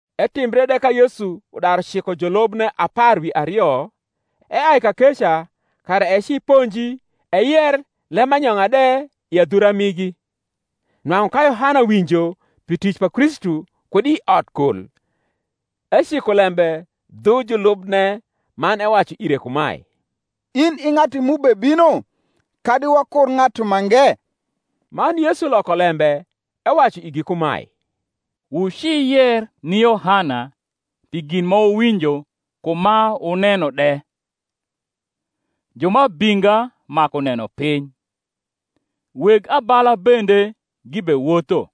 Etimbre de ka Yesu daru ciko julubne apar wi ario, eai kakeca kara eci ponji eyer lembanyong’a de i adhura migi. Nwang’u ka Yohana winjo pi tic pa Kristu kud i odkol, eciko lembe dhu julubne man ewacu ire kumae, In i ng’atu m’ubebino, kadi wakur ng’atu mange? Man Yesu loko lembe ewacu igi kumae, Wuci yer ni Yohana pi gin ma wuwinjo ku ma wuneno de: ju ma abinga maku nenopiny, weg abala bende gibewotho,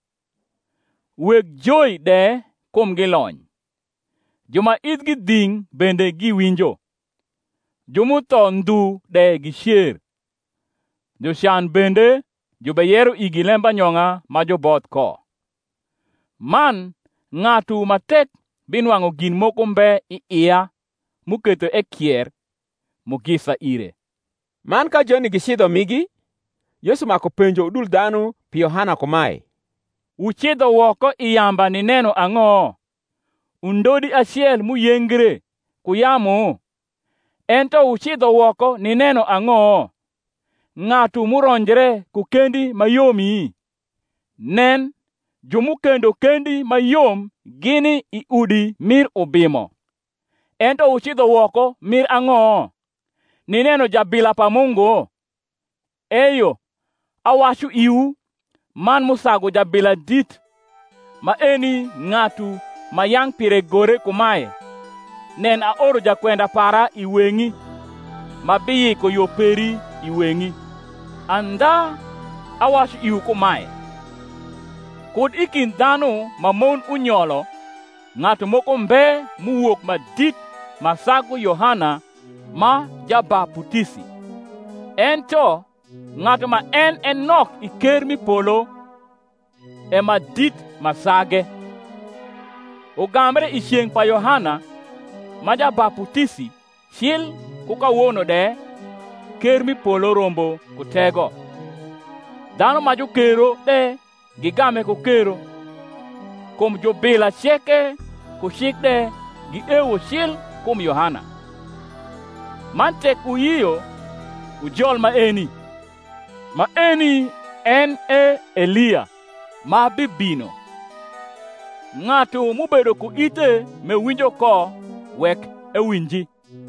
weg joi de kumgi lony, ju ma ithgi dhing’ bende giwinjo, ju m’utho ndhu de gicer, jucan bende jubeyero igi lembanyong’a ma juboth ko. Man ng’atu ma tek binwang’u gin moko mbe i ia m’uketho ekier, mugisa ire. Man ka joni gicidho migi, Yesu maku penjo udul dhanu pi Yohana kumae, Wucidho woko i yamba nineno ang’o? undodi acel m’uyengre ku yamu? Ento wucidho woko nineno ang’o? ng’atu m’uronjre ku kendi ma yomi? Nen, ju m’ukendo kendi ma yom gini i udi mir ubimo. Ento wucidho woko mir ang’o? nineno jabila pa Mungu? Eyo, awacu iwu, man m’usagu jabila dit. Maeni ng’atu, ma yang’ pire gore kumae, Nen, aoro jakwenda para i weng’i, Ma biyiko yo peri i weng’i. Andha awacu iwu kumae, Kud i kind dhanu ma mon unyolo ng’atu moko mbe m’uwok ma dit ma sagu Yohana ma Jabaputisi: ento ng’atu ma en e nok i ker m’i polo e ma dit ma sage. Ugambre i ceng’ pa Yohana ma Jabaputisi cil ku kawono de ker m’i polo rombo ku tego, dhanu ma jukero de gigame ku kero. Kum jubila ceke ku cik de giewo cil kum Yohana. Man tek wuyio wujol maeni, maeni en e Elia, ma bibino. Ng’atu m’ubedo ku ithe m’ewinjo ko, wek ewinji.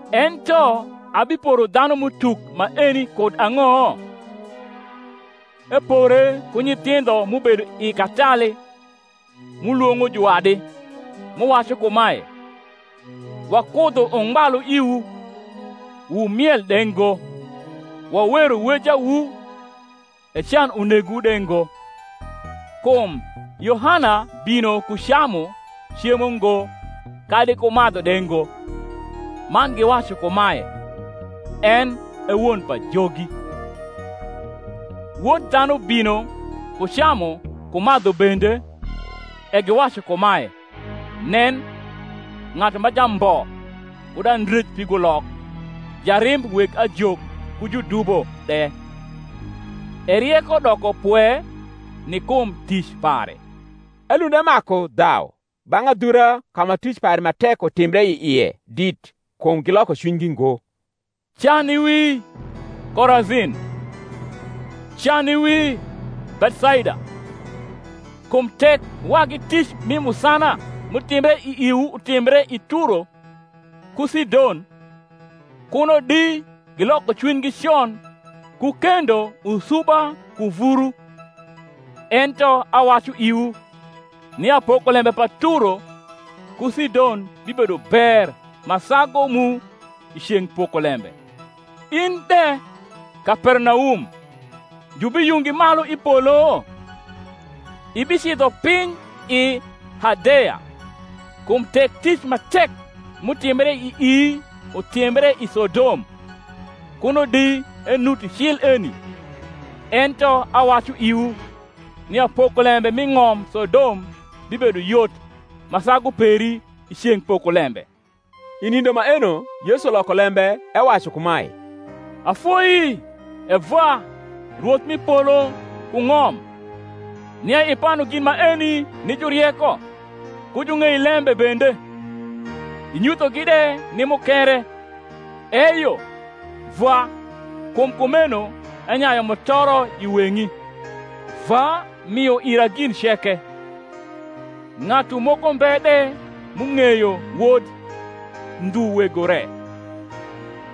Ento abiporo dhanum’utuk maeni kud ang’o? Epore ku nyithindho m’ubedo i katali, m’ulwong’o juwadi, m’uwacu kumae, Wakudho ungbalu iwu, wumiel de ngo; wawero wejawu, e can unegowu de ngo. Kum Yohana bino ku camu cemo ngo kadi ku madhu de ngo, man giwacu kumae, En e won pajogi. Wod dhanu bino ku camu ku madhu bende, e giwacu kumae, Nen, ng’atu ma jambo kud andrej pigulok, jarimb weg ajok ku judubo de! E rieko doko pwe ni kum tic pare. Elund emaku dhau bang’ adhura ka ma tic pare ma tek utimbre i ie dit, kum giloko cwinygi ngo. Can i wii, Korazin! can i wii, Bethsaida! kum tek wagi tic mi musana m’utimbre i iwu utimbre i Turo ku Sidon kuno di giloko cwinygi con ku kendo usuba ku vuru. Ento awacu iwu, nia pokolembe pa Turo ku Sidon bibedo ber ma sagu mu i ceng’ pokolembe. In de, Kapernaum, jubiyungi malu i polo? ibicidho piny i Hadeya: kum tek tic ma tek m’utimbre ii utimbre i Sodom, kuno di enuti cil eni. Ento awacu iwu nia pokolembe mi ng’om Sodom bibedo yot ma sagu peri, i ceng’ pokolembe. I nindo maeno Yesu loko lembe ewacu kumae, Afoi, E Vwa, Rwoth m’i polo ku ng’om, nia ipanu gin maeni ni jurieko ku jung’eilembe bende, inyuthogi de ni mukere: eyo, Vwa, kum kumeno enyayu mutoro i weng’i. Vwa mio ira gin ceke: ng’atu moko mbe de m’ung’eyo Wod, ndhu Wego re;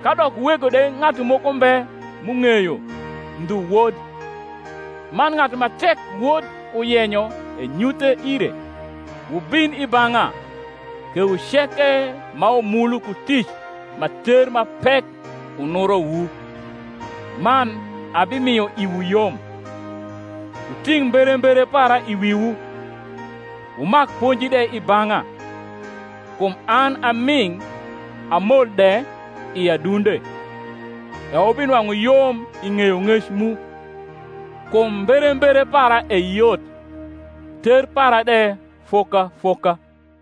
kadok Wego de ng’atu moko mbe m’ung’eyo, ndhu Wod, man ng’atu ma tek Wod uyenyo enyuthe ire. Wubin i bang’a, kewu ceke ma wumulu ku tic ma ter ma pek unurowu, man abimio iwu yom. Wuting’ mberembere para i wiwu, wumak ponji de i bang’a; kum an a ming’ a mol de i adunde: e wubinwang’u yom i ng’eyong’ec mu. Kum mberembere para e yot, ter para de foka foka.